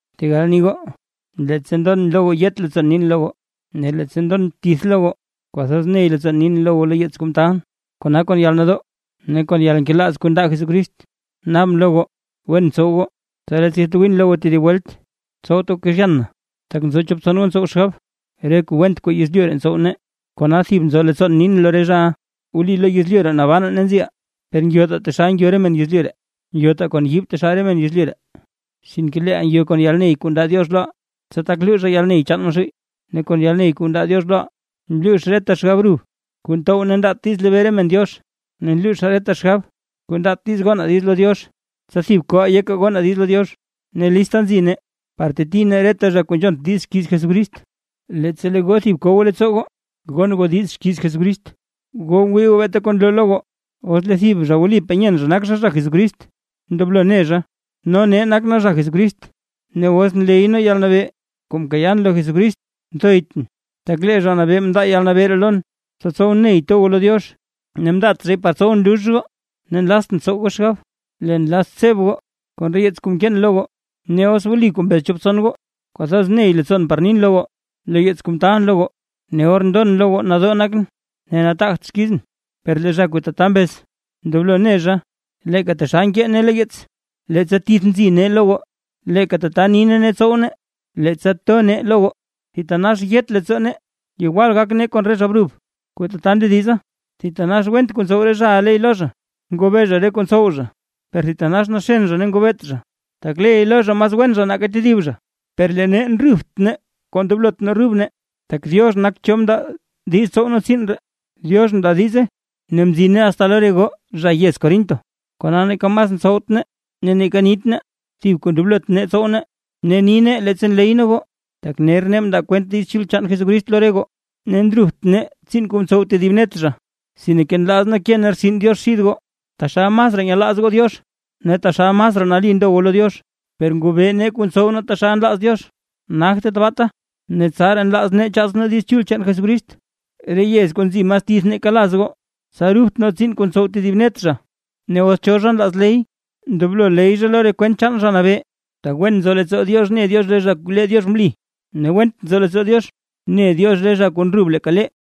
Tegal ni goo, leettsa ndon lo goo yet leettsoon nin lo goo, ne leettsa ndon tith lo goo kwathoz ney leettsoon nin lo goo lo yeets kuu mtaalʼn. Kona kon yalnadoo ne kon yalnkelaaz kuu ndaa Jesucrist naabʼn lo goo wen tsow goo. Tsa leettsa yatwiin lo goo tedib welt, tsowt goo kezhyan na, tak nzo chop tson goo ntsow xgab, re kuu went kuu nzo yezlyu ree ntsow nee; kona thib nzo leettsoon nin lo re zhaʼa. Wli lo yezlyu ree nabanaa ne nziʼaa, per ngyotaa taxal ngyo re men yezlyu ree. Ngyotaa kon yiib taxal re men yezlyu ree, sinke leeʼaa ngyo kon yalney kuu ndaa Diox loʼaa, tsa tak luuzhaa yalney chaan Maxuuy, ne kon yalney kuu ndaa Diox loʼaa nluux reta xgab rub kuu ntow ne ndaat diiz lebee re men Diox. Ne nluuzhaa reta xgab kuu ndaat diiz gonaa diiz lo Diox, tsa thib koʼaa yekaa gonaa diiz lo Diox. Ne lista nzi nee, par teti nee reta zha kuu nzhont diiz xkiiz Jesucrist, leettsa lee goo thib ko goo leettsoo goo gon goo diiz xkiiz Jesucrist. Goo ngwii goo beeta kuu nloo lo goo. Os lee thib zha wlipaa nyeen zha nak zha zha Jesucrist, ndoblo ne zha, no nee nak nee zha Jesucrist. Ne os nleyʼn yalnabee kuu mkayaan lo Jesucrist nthoytʼn, tak lee Zha Nabee mndaa yalnabee ree lon, tsa tsowʼn ney to goo lo Diox, ne mndaat zhay par tsowʼn lux goo. Ne nlaztʼn tsow goo xgab, leen nlazʼn tsebʼn goo, kon re yeets kuu mkeen lo goo. Ne os wli kuu mbez chop tson goo, kwathoz ney leettsoon par nin lo goo lo yeets kuu mtaalʼn lo goo, ne or ndon lo goo nadoo nakʼn ne nataagt xkizʼn. Per lee zha kuu tata mbez, ndoblo ne zha leeka taxal nkee nee lo yeets, leettsa tith nzi nee lo goo, leeka tata ni nee ne tsow nee, leettsa to nee lo goo. Thitanax yet leettsoo nee yewal gak nee kon re zha brub kuu tata ndediza. Thitanax went kuu ntsow re zhaʼa ley lo zha, ngobee zha re kuu ntsow zha, per thitanax naxen zha ne ngobeet zha, tak mas wen zha nake tedib zha ley lo zha. Per lee nee ndrubt nee kuu ndoblot nee rub nee. Tak Diox nak cho mndaa diiz tsow nee tsiin ree, Diox mndaa diize ne mzine asta lo re goo zha yez Corinto. Kona neeka mas ntsowt nee ne neeka nit nee, thib kuu ndoblot nee tsow nee ne ni nee leettsa nley nee goo, tak ner nee mndaa kwent Diiz Chul chaan Jesucrist lo re goo. Ne ndrubt nee tsiin kuu ntsow tedib net zha. Sinke nlaaz nee ke nee rtsin Diox xid goo, taxal masraa nyelaaz goo Diox ne taxal masraa nali ndo goo lo Diox; per ngobee nee kuu ntsow nee taxal nlaaz Diox, nagte tabaata. Ne tsaraa nlaaz nee chaats nee Diiz Chul chaan Jesucrist re yez kuu nzi mas tith nake laz goo, tsa rubt nee tsiin kuu ntsow tedib net zha. Ne os cho nlaaz ley, ndoblo ley zha lo re kwent chaan Zha Nabee. Tak wen nzo leettsoo Diox ne Diox re zha kuu lee Diox mli, ne went nzo leettsoo Diox ne Diox re zha kuu ndrub leeka lee.